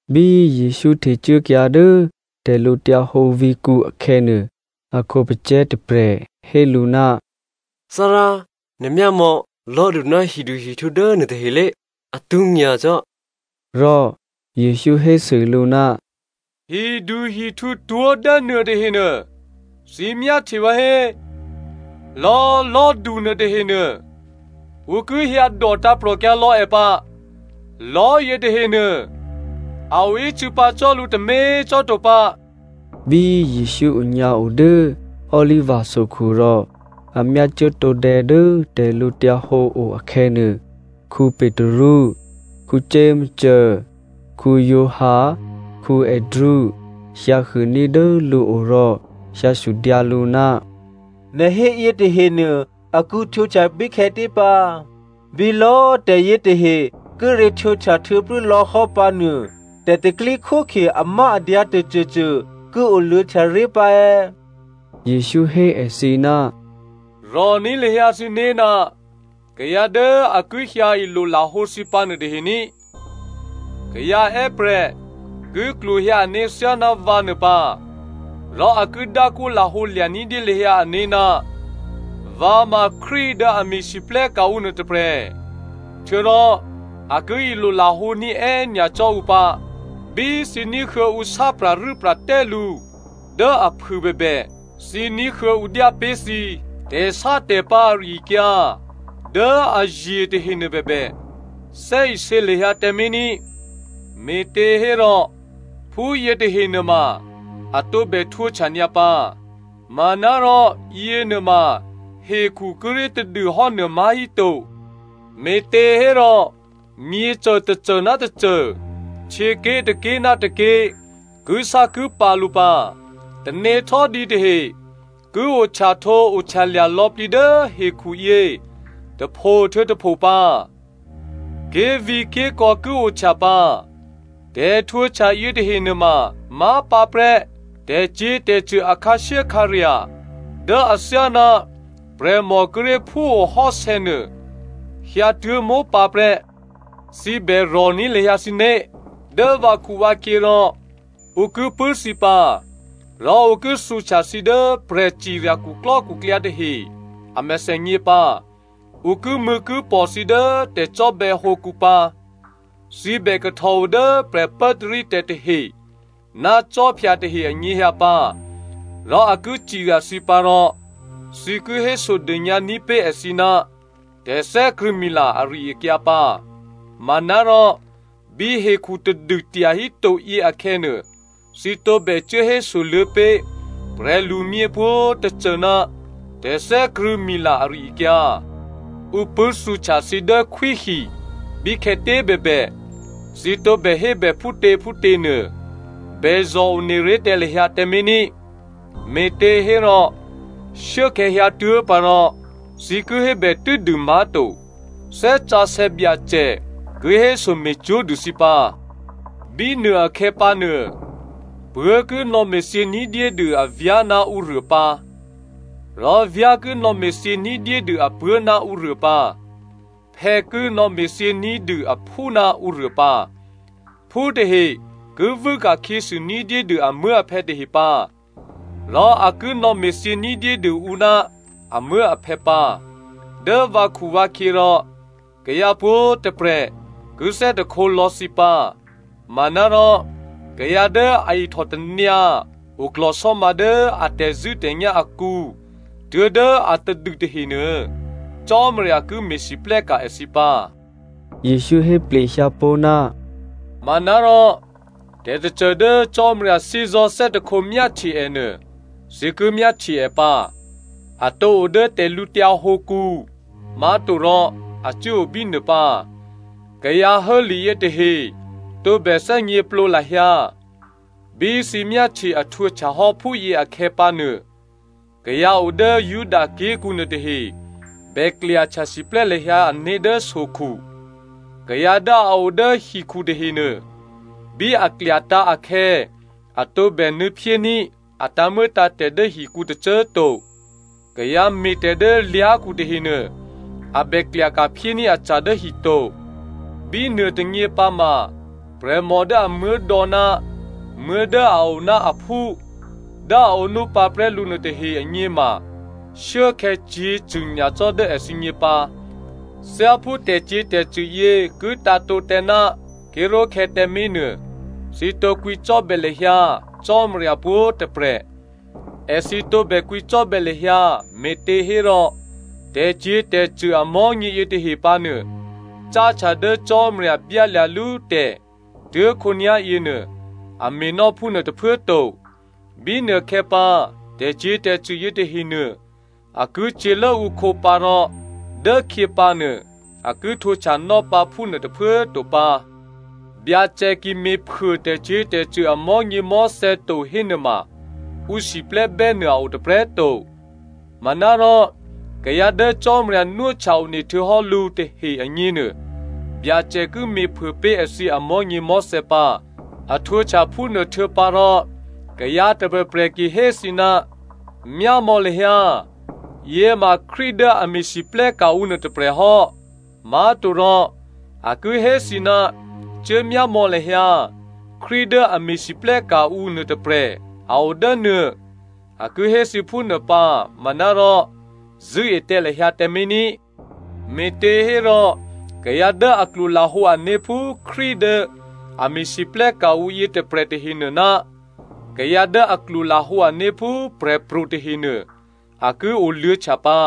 Bí Jesǔ htecuốkyǎ dố tè̤lǔhǒdu vǐ̤kǔ akhè̌nuô, a khǒpacè̤̌ tôprè̤ hé lǔ, “Thárá꤮ nè̤ myámò̌ lò̤́du ná hiduhihtǔ dố nuôtahe lé, atwó̤ nyacò́!” Rò Jesǔ hésû lǔ, “Hiduhihtǔtwó̤ dốnuô tahenuô, thǐ myáhtye vǎ hé? Lò̌꤮ lò̤́du nuôtahenuô ǔ ki hyǎdò tǎ̤prò̤kyǎ lò̌ è pǎ. Lò̤́ yětahenuô a oícû̌ pǎ cò́ lǔ tômě꤮ cò́ to pǎ.” Bí Jesǔ onyǎo dố Oliva sokhu rò a myácuố tǒdè̌ dố tè̤lǔhǒdu o akhè̌nuô, Petru, Jakomo, Giovanni, Andrea, hyǎhuôní̤ dố lǔo rò hyǎsudyǎ lǔ, “Nè̤ hé yětahenuô a ki htwǒhtya bíkhè̌tě pǎ? Bí lò̌꤮ tè̤yětahe kíré̤ htwǒhtya htuô̌plû́lò̌hò́ pǎnuô tè̤pro̤tè̤prya̤ amáadyǎ tôcôcô ki oluô̌htya ré̤ pǎ è̌?” Jesǔ hé èthǐ, “Rò̤ní̤ lahyǎ thǐné̤ ná kayǎ dố a ki hyǎ ilolahǒ thǐ pǎ nuôtahe ní꤮. Kayǎ è́prè̤ ki klwohyǎ ané̤ thyáná vǎ nuô pǎ rò a ki dákwó lahǒ lya̤ ní̤dyé lahyǎ ané̤, ‘Vǎ ma Krístu dố a me̤lwóhteka̤ ǔ nuôtôprè̤’ htuô̌rò a ki ilolahǒní̤ è́nyacò́ ǔ pǎ. Bí thǐ ní̤huô̌ ǔ sá pra̤rû́pra̤tè́ lǔ dố aphû bèbè, thǐ ní̤huô̌ ǔ dyá pé̤ thǐ tè̤sátè̤pǎ̤ ari-akyǎ dố aye̤ tahenuô bèbè, thè́isě lahyǎ tǎmé̤ ní꤮. Me̤těhérò phúyě tahe nuôma a bè htwǒhtya nyǎ pǎ, manárò yěnuôma hekhu kíré̤ tadû hò́nuô má̤híto. Me̤těhérò myěcô tôcô ná tôcô, htyěké̤ tôké̤ ná tôké̤ kisákipǎ̤ lǔ pǎ. Tanéhtò́dǐ tahe ki ohtyahtǒohtyalya̤ lò̌plǐ dố hekhuyě tôpho htuô̌ tôpho pǎ. Ké̤vǐ̤ké̤kò̌ ki ohtya pǎ. Tè̤htwǒhtya yětahe nuôma má̤pǎprè́ tè̤cyě̤tè̤cṳ̂ a khǎshyékhǎrya̤ dố athyáná prè̤mò kíré̤ phúo hò́sè̌nuô hyǎtuố̤ mópǎprè́. “Thǐ bè rò̤ní̤ lahyǎ thǐné̤. Dố vǎkhuvǎkhyě rò ǔ ki pṳ̂́ thǐ pǎ, rò ǔ ki thǔhtya thǐ dố prè̤cirya khuklò́khuklyǎ tahe a mèthènyě pǎ. Ǔ kimṳ̂̌kipò̤ thǐ dố tè̤cò́bè̌hǒkǔ pǎ. Thǐ bè kahtòo dố prè̤pốtarítè̤ tahe ná khwí tahe anyěhyǎ pǎ rò a ki cirya thǐ pǎ rò thǐ ki hésodônyǎ ní̤pé̤ èthǐ ná tè̤thè́krṳ̂̌mila ari-akyǎ pǎ. Manárò bí hekhu tadû tyahíto yě akhè̌nuô, thǐ tǒbè cuố hésoluô̌ pé̤ prè̤lumyě pwǒ̤꤮ tôcô ná tè̤thè́krṳ̂̌mila ari-akyǎ. Ǔ pṳ̂́thǔhtya thǐ dố khwíhi bíkhè̌tě꤮ bèbè, thǐ tǒbè hébè phútě phútěnuô bèzò̤one ré̤ tǎ lahyǎ tǎmé̤ ní꤮. Me̤těhérò shuốkhè̌ hyǎtuố̤ pǎ rò thǐ ki hébè tû́dû má̤to, Thè́ Sǎsè̌ Byacè ki héso me̤cwó̤ dû thǐ pǎ. “Bínuôakhè̌ pǎnuô, puố̤ ki nò̌me̤thyě ní̤dyédû avyá̤ ná ǔruô pǎ, rò vyá̤ ki nò̌me̤thyě ní̤dyédû apuố̤ ná ǔruô pǎ, phè̌ ki nò̌me̤thyě ní̤dû aphú ná ǔruô pǎ, phú tahe ki vû́ ka̤khyěsû ní̤dyédû amuố̤aphè̌ tahe pǎ, rò a ki nò̌me̤thyě ní̤dyédû ǔ ná amuố̤aphè̌ pǎ. Dố vǎkhuvǎkhyě rò kayǎ pwǒ̤꤮ tôprè̤ ki thè́hte lò̌ thǐ pǎ. Manárò kayǎ dố a ihtòtanyǎ oklò̤sò́ma dố a tè̤zṳ̂́tè̤nyá̤ akǔ tuố̤dố atadû tahenuô Cò́marya ki me̤lwóhteka̤ èthǐ pǎ.” Jesǔ héplehyǎ pó̤, “Manárò tè̤tôcô dố Cò́marya thè́zò̤́ thè́hte myáhtye è nuô, thǐ ki myáhtye è pǎ. A tǒ o dố tè̤lǔtyǎ hǒkǔ má̤to rò a cuố o bínuô pǎ. (Kayǎ hố li yětahe tǒbè thè́gněplǒ lahyǎ.) Bí thǐ myáhtye a htwǒhtya hò́ phúyě akhè̌ pǎnuô, kayǎ o dố Juda ké̤kǔ nuôtahe bè klyahtya siplè́ lahyǎ ané̤ dố sokhu. Kayǎ dố a o dố hikhu tahenuô, bí a klyatǎ̤ akhè̌ a tǒbè nuô̌phyécuốní̤ a tǎ̤muô̌tǎ̤tè̤ dố hikǔ tôcô꤮ to. Kayǎ me̤tè̤ dố lyá̤khu tahenuô a bè klyaka̤ phyéní̤ aca̤ dố hi to. Bínuôtônyě pǎma prè̤mò dố amuố̤dò̌ ná muố̤ dố a oná aphú dố a ǒnú pǎprè́ lǔ nuôtahe agněma shuốkhè̌ cyě̤cṳ̂ nyacò́ dố èthǐgně pǎ. Thyáphú tè̤cyě̤tè̤cṳ̂ yě ki tǎ̤tǒ tǎ ná ké̤ró̤khè̌ tǎmé̤ nuô, thǐ tǒ kwǐcò́bè̌ lahyǎ Cò́marya pwǒ̤꤮ tôprè̤. Èthǐ tǒbè kwǐcò́bè̌ lahyǎ me̤těhérò, tè̤cyě̤tè̤cṳ̂ amò̤́nyě yětahe pǎ nuô, cáhtya dố Cò́marya byálya̤lú tè̤ tuố̤khǒnyá̤ yěnuô a me̤nò́ phúnuô tôphuố꤮ to. Bínuôkhè̌pǎ tè̤cyě̤tè̤cṳ̂ yětahenuô a ki cyě̤lốǔkhǒ pǎ rò dốkhyěpǎ nuô a ki htwǒhtyanò́ pǎ phúnuô tôphuố꤮ to pǎ. Byacè ki me̤phuô tè̤cyě̤tè̤cṳ̂ amò̤́nyěmò̤́thè̌ to hénuôma ǔ siplè́bè́ nuô a o tôprè̤꤮ to. Manárò kayǎ dố Cò́marya nwóhtya one htuô̌hò́ lǔ tahe agněnuô Byacè ki me̤phuô pé̤ èthǐ amò̤́nyěmò̤́thè̌ pǎ. A htwǒhtya phúnuô htuô̌pǎrò kayǎ tôprè̤prè̤ ki hé thǐ, ‘Myámò̌ lahyǎ, yě ma Krístu dố a me̤lwóhteka̤ ǔ nuô tôprè̤ hò́,’ má̤torò a ki hé thǐ, ‘Cuố myámò̌ lahyǎ, Krístu dố a me̤lwóhteka̤ ǔ nuôtôprè̤ a o dố nuô,’ a ki hé thǐ phúnuô pǎ manárò zṳ̂́e tǎ lahyǎ tǎmé̤ ní꤮. Me̤těhérò kayǎ dố a klwolahǒ ané̤ phú Krístu dố a me̤lwóhteka̤ ǔ yětôprè̤ tahenuô ná kayǎ dố a klwolahǒ ané̤ phú prè̤pro̤ tahenuô, a ki oluô̌htya pǎ.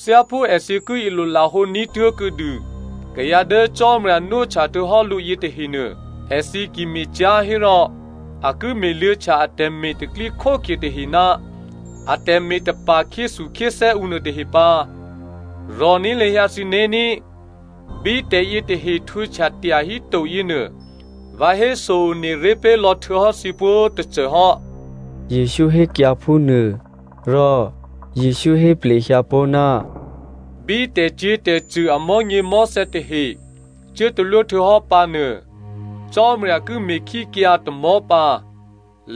Thyáphú èthǐ ki ilolahǒ ní̤tuố̤ kuô̌dû kayǎ dố Cò́marya nwóhtya htuô̌hò́ lǔ yětahenuô, èthǐ ki me̤cyá̤ hérò, a ki me̤luô̌htya atè̤me̤ tè̤pro̤tè̤prya̤ tahe ná atè̤me̤ tapa̤ khyéthukhyéthè́ ǔ nuôtahe pǎ. Rò̤ní̤ lahyǎ thǐné̤ ní꤮. Bí tè̤yětahe htwǒhtya tyahíto yěnuô, vǎ héso one ré̤ pé̤ lò̌ htuô̌hò́ thǐ pwǒ̤꤮ tôcô hò́,” Jesǔ hékyǎ phúnuô. Rò Jesǔ hé plehyǎ pó̤, “Bí tè̤cyě̤tè̤cṳ̂ amò̤́nyěmò̤́thè̌ tahe cuố talwóhtuô̌hò́ pǎ nuô, ‘Cò́marya ki me̤ khíkyǎ tamò̤́ pǎ.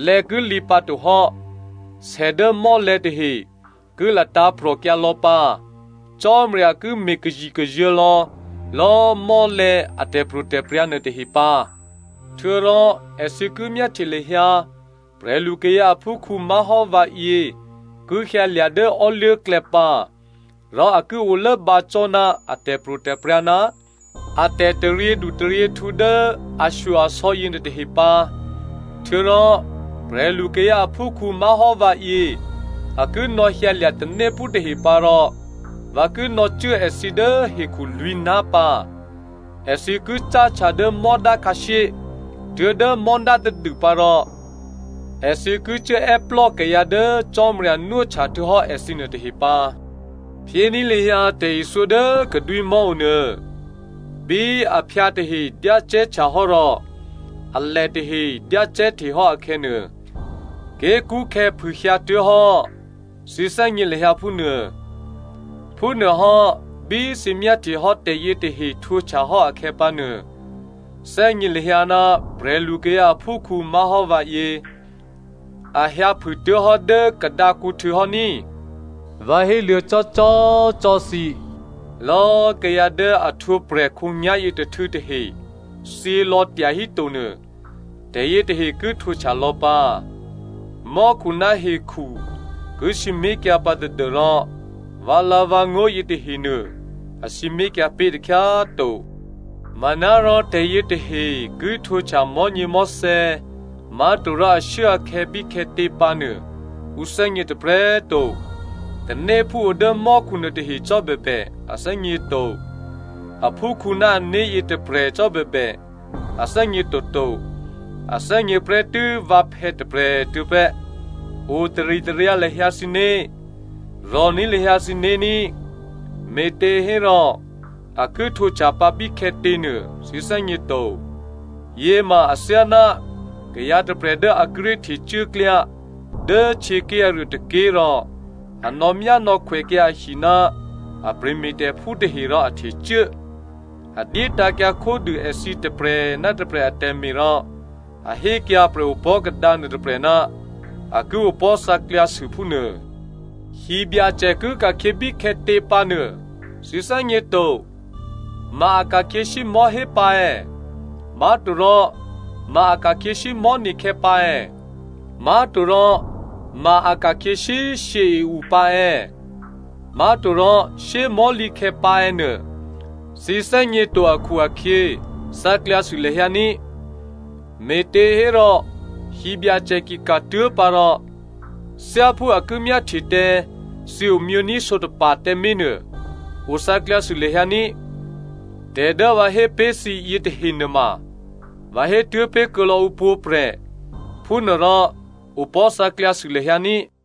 Lè̌ ki lǐ pǎtohò́. Sè dố mò́lè̤̌ tahe ki latǎ̤prò̤kyǎ lò̌pǎ. Cò́marya ki me̤kazikazuô̤̌ lò̌lò̌꤮ mò́lè̤̌ a tè̤pro̤tè̤prya̤ nuôtahe pǎ.’ “Htuô̌rò èthǐ ki myáhtye lahyǎ prè̤lukayǎ aphúkhǔ má̤hò́ vǎyě ki hyǎlya̤ dố ò́luố̤klè̌ pǎ, rò a ki olốbǎ cò́ ná a tè̤pro̤tè̤prya̤ ná a tè̤taryědu taryěhtǔ dố ashyo-asò̌ yěnuôtahe pǎ. Htuô̌rò prè̤lukayǎ aphúkhǔ má̤hò́ vǎyě a ki nò̌hyǎlya̤ tanéphú tahe pǎ rò vǎ ki nò̌cuố èthǐ dố hekhu lwǐ̤ná̤ pǎ, èthǐ ki cáhtya cuố dố mò́dá khǎshyé tuố̤dố mò́dá tadû pǎ rò èthǐ ki cuốè́plò́ kayǎ dố Cò́marya nwóhtya htuô̌hò́ èthǐ nuôtahe pǎ. “Phyéní̤ lahyǎ tè̤ithyó dố kadwímò̤́ onuô. Bí aphyǎ tahe dyácè̤́htya hò́ rò alè tahe dyácè̤́hte hò́ akhè̌nuô, ké̤kṳ́khè̌ phûhyǎtuố̤hò́, thǐ thè́gně lahyǎ phúnuô. Phúnuôhò́ bí thǐ myáhtyehò́ tè̤yě tahe htwǒhtyahò́ akhè̌pǎnuô, thè́gně lahyǎ ná prè̤lukayǎ aphúkhǔ má̤hò́ vǎyě a hyǎphûtuố̤hò́ dố kadǎkǔhtû̌ hò́ ní꤮. Vǎ héluô̌cò́cò́꤮ cò́ thǐ, lò̌꤮ kayǎ dố a ohtwǒprè̤ khǒnyá̤yětôhtû̌ tahe thyělò̌ tyahíto nuô, tè̤yětahe ki htwǒhtya lò̌ pǎ. Mò́khu ná hekhu ki sǐmé̤kyǎ pǎ tadû́rò vǎlǎ̤vǎngó̤ yětahenuô a sǐmé̤kyǎ pé̤ takhyá꤮ to. “Manárò tè̤yětahe ki htwǒhtya mò̤́nyěmò̤́thè̌, má̤torò ashuốakhè̌ bíkhè̌tě pǎnuô ǔ thè́gně tôprè̤꤮ to. Tanéphú o dố mò́khu nuôtahe cò́ bèbè a thè́gně to. Aphúkhǔ ná ané̤ yětôprè̤ cò́꤮ bèbè, a thè́gně toto. A thè́gně prè́tû́ vǎphè̌ tôprè̤꤮ tuô̌prè́. Otaritaryǎ lahyǎ thǐné̤, rò̤ní̤ lahyǎ thǐné̤ ní꤮, me̤těhérò a ki htwǒhtya pǎ bíkhè̌tě nuô thǐ thè́gně to. Yěma athyáná kayǎ tôprè̤ dố a kíré̤ htecuố klyá dố htyěké̤ aruô tôké̤ rò a nò̌myánò̌khwèkyǎ ahi ná a prè̤me̤tè̤phú tahe rò a htecuố. A dyétǎ̤kyǎ khódû èthǐ tôprè̤ ná tôprè̤ atè̤me̤ rò a hékyǎ prè̤opò̤́ kadǎ nuôtôprè̤ ná a ki opò̤́ thǎklyǎsû phúnuô. “Hibyacè ki ka̤khyě bíkhè̌tě pǎ nuô thǐ thè́gně to. Ma a ka̤khyě shyé꤮ mò̤́hé pǎ è̌, má̤torò ma a ka̤khyě shyé꤮ mò̤́ne̤khè̌ pǎ è̌, má̤torò ma a ka̤khyě shyé꤮ shyě i-u pǎ è̌, má̤torò shyé꤮ mò̤́lǐkhè̌ pǎ è̌ nuô, thǐ thè́gně to akhu-akhyě thǎklyǎsû lahyǎ ní꤮. Me̤těhérò hibyacè ki ka̤tuố̤khyé pǎ rò thyáphú a ki myáhtye tǎ thǐ omyění̤ sǒtapa̤ tǎmé̤ nuô, o thǎklyǎsû lahyǎ ní꤮. Tè̤ dố vǎ hé pé̤ thǐyě tahe nuôma, vǎ hétuố̤pé̤ kuô̌lò̌ ǔ pwǒ̤prè̤, phúnuôrò ‘Opò̤́ thǎklyǎsû lahyǎ ní꤮.’”